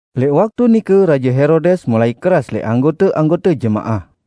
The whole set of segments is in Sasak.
Lẽq waktu nike Raje Herodes mulai keras lẽq anggote-anggote jemaah.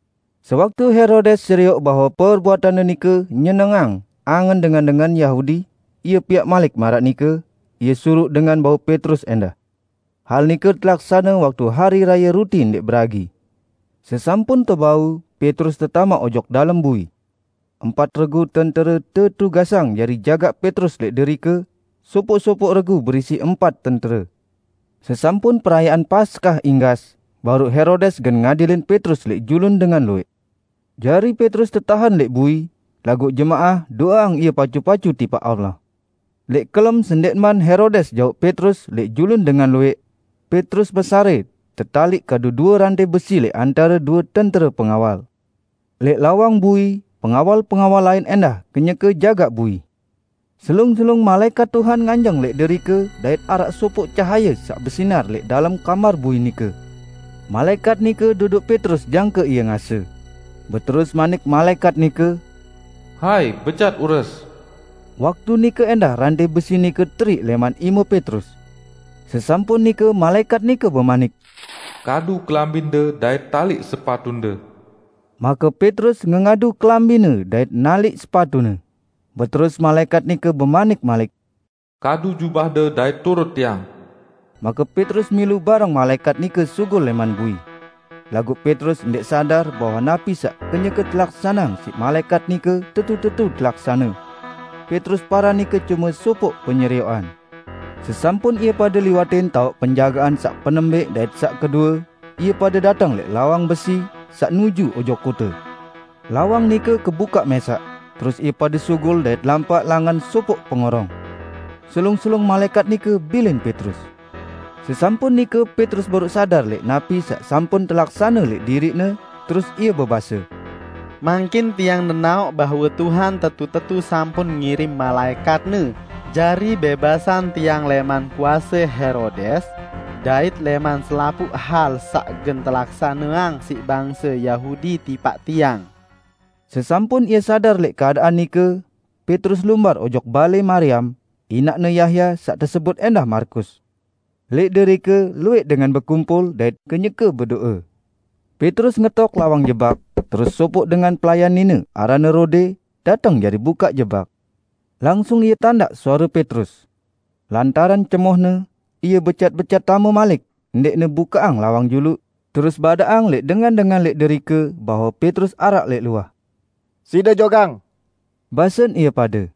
Sewaktu Herodes serioq bahwe perbuatanne nike nyenengang angen dengan-dengan Yahudi, ie piaq malik maraq nike; ie suruq dengan bau Petrus ẽndah. Hal nike telaksane waktu Hari Raye Ruti Ndẽq Beragi. Sesampun tebau, Petrus tetamaq ojok dalem bui. Empat regu tentere tetugasang jari jagaq Petrus lẽq derike -- sopoq-sopoq regu berisi empat tentere. Sesampun perayaan Paskah inggas, baruq Herodes gen ngadilin Petrus lẽq julun dengan luwẽq. Jari Petrus tetahen lẽq bui; laguq jemaah do'eang ie pacu-pacu tipaq Allah. Lẽq kelem sendẽqman Herodes jauq Petrus lẽq julun dengan luwẽq, Petrus mesarẽ tetaliq kadu due rantẽ besi lẽq antare due tentere pengawal. Lẽq lawang bui, pengawal-pengawal lain ẽndah kenyeke jagaq bui. Selung-selung malaẽkat Tuhan nganjeng lẽq derike dait araq sopoq cahaye saq besinar lẽq dalem kamar bui nike. Malaẽkat nike dodoq Petrus jangke ie ngase. Beterus manik malaẽkat nike, "Hai, becat ures!" Waktu nike ẽndah rantẽ besi nike teriq lẽman ime Petrus. Sesampun nike malaẽkat nike bemanik, "Kadu kelambinde dait taliq sepatunde." Make Petrus ngengadu kelambine dait naliq sepatune. Beterus malaẽkat nike bemanik malik, "Kadu jubahde, dait turut tiang." Make Petrus milu bareng malaẽkat nike sugul lẽman bui. Laguq Petrus ndẽq sadar bahwe napi saq kenyeke telaksaneang siq malaẽkat nike siq malaẽkat nike tetu-tetu telaksane. Petrus paran nike cume sopoq penyerioqan. Sesampun ie pade liwatin taoq penjagaan saq penembẽq dait saq kedue, ie pade dateng lẽq lawang besi, saq nuju ojok kote. Lawang nike kebukaq mẽsaq, terus ie pade sugul dait lampaq langan sopoq pengorong. Selung-selung malaẽkat nike bilin Petrus. Sesampun nike Petrus baruq sadar lẽq napi saq sampun telaksane lẽq diriqne, terus ie bebase, "Mangkin tiang nenaoq bahwe Tuhan tetu-tetu sampun ngirim malaẽkat-Ne jari bẽbasang tiang lẽman kuase Herodes, dait lẽman selapuq hal saq gen telaksaneang siq bangse Yahudi tipaq tiang." Sesampun ie sadar lẽq keadaan nike, Petrus lumbar ojok balẽ Mariam, inaqne Yahya saq tesebut ẽndah Markus. Lẽq derike luwẽq dengan bekumpul dait kenyeke bedo'e. Petrus ngetok lawang jebak, terus sopoq dengan pelayan nine aranne Rode, dateng jari bukaq jebak. Langsung ie tandaq suare Petrus. Lantaran cemohne, ie becat-becat tame malik ndẽqne bukaqang lawang juluq, terus badaqang lẽq dengan-dengan lẽq derike bahwe Petrus araq lẽq luah. "Side jogang!" basen ie pade.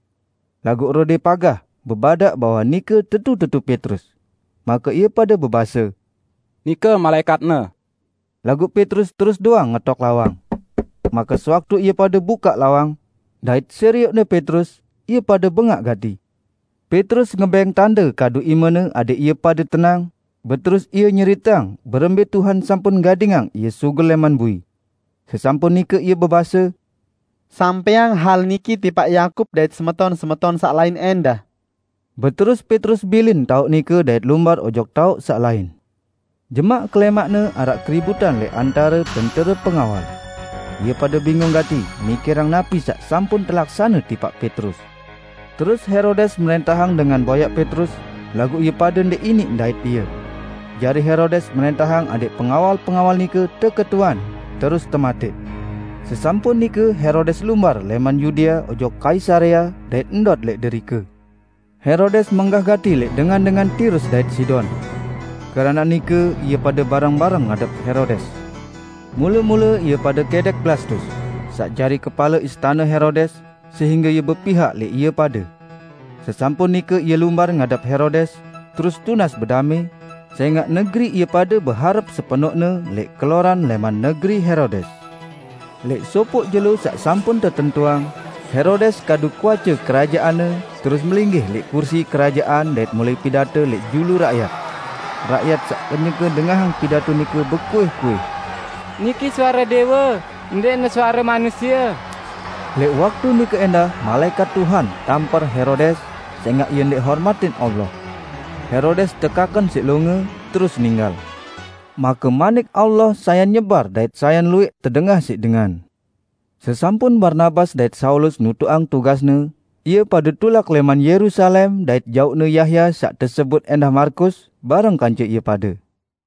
Laguq Rode pagah bebadaq bahwe nike tetu-tetu Petrus. Make ie pade bebase, "Nike malaẽkatne!" Laguq Petrus terus doang ngetok lawang. Make sewaktu ie pade bukaq lawang, dait serioqne Petrus, ie pade bengaq gati. Petrus ngebẽng tande kadu imene adẽq ie pade tenang, beterus ie nyeriteang berembẽ Tuhan sampun gadingang ie sugul lẽman bui. Sesampun nike ie bebase, "Sampẽang hal niki tipaq Yakub dait semeton-semeton saq lain ẽndah." Beterus Petrus bilin taoq nike dait lumbar ojok taoq saq lain. Jemaq kelẽmaqne araq keributan lẽq antare tentere pengawal. Ie pade bingung gati mikirang napi saq sampun telaksane tipaq Petrus. Terus Herodes mrẽntahang dengan boyaq Petrus, laguq ie pade ndẽq iniq ndait ie. Jari Herodes mrẽntahang adẽq pengawal-pengawal nike teketuan terus tematẽq. Sesampun nike Herodes lumbar lẽman Yudea ojok Kaisarea dait ndot lẽq derike. Herodes menggah gati lẽq dengan-dengan Tirus dait Sidon. Keranaq nike ie pade bareng-bareng ngadep Herodes. Mule-mule ie pade kẽdẽq Blastus, saq jari kepale istane Herodes, sehingge ie bepihak lẽq ie pade. Sesampun nike ie lumbar ngadep Herodes, terus tunas bedamẽ, sẽngaq negeri ie pade beharep sepenoqne lẽq keloran lẽman negeri Herodes. Lẽq sopoq jelo saq sampun tetentuang, Herodes kadu kuace kerajaanne, terus melinggih lẽq kursi kerajaan dait mulai pidato lẽq julu rakyat. Rakyat saq kenyeke dengahang pidato nike bekuih-kuih, "Niki suare Dẽwe, ndẽqne suare manusie!" Lẽq waktu nike ẽndah malaẽkat Tuhan tamper Herodes, sẽngaq ie ndẽq hormatin Allah. Herodes tekaken siq longe, terus ninggal. Make Manik Allah sayan nyebar dait sayan luwẽq tedengah siq dengan. Sesampun Barnabas dait Saulus nutuqang tugasne, ie pade tulak lẽman Yerusalem dait jauqne Yahya saq tesebut ẽndah Markus, bareng kance ie pade.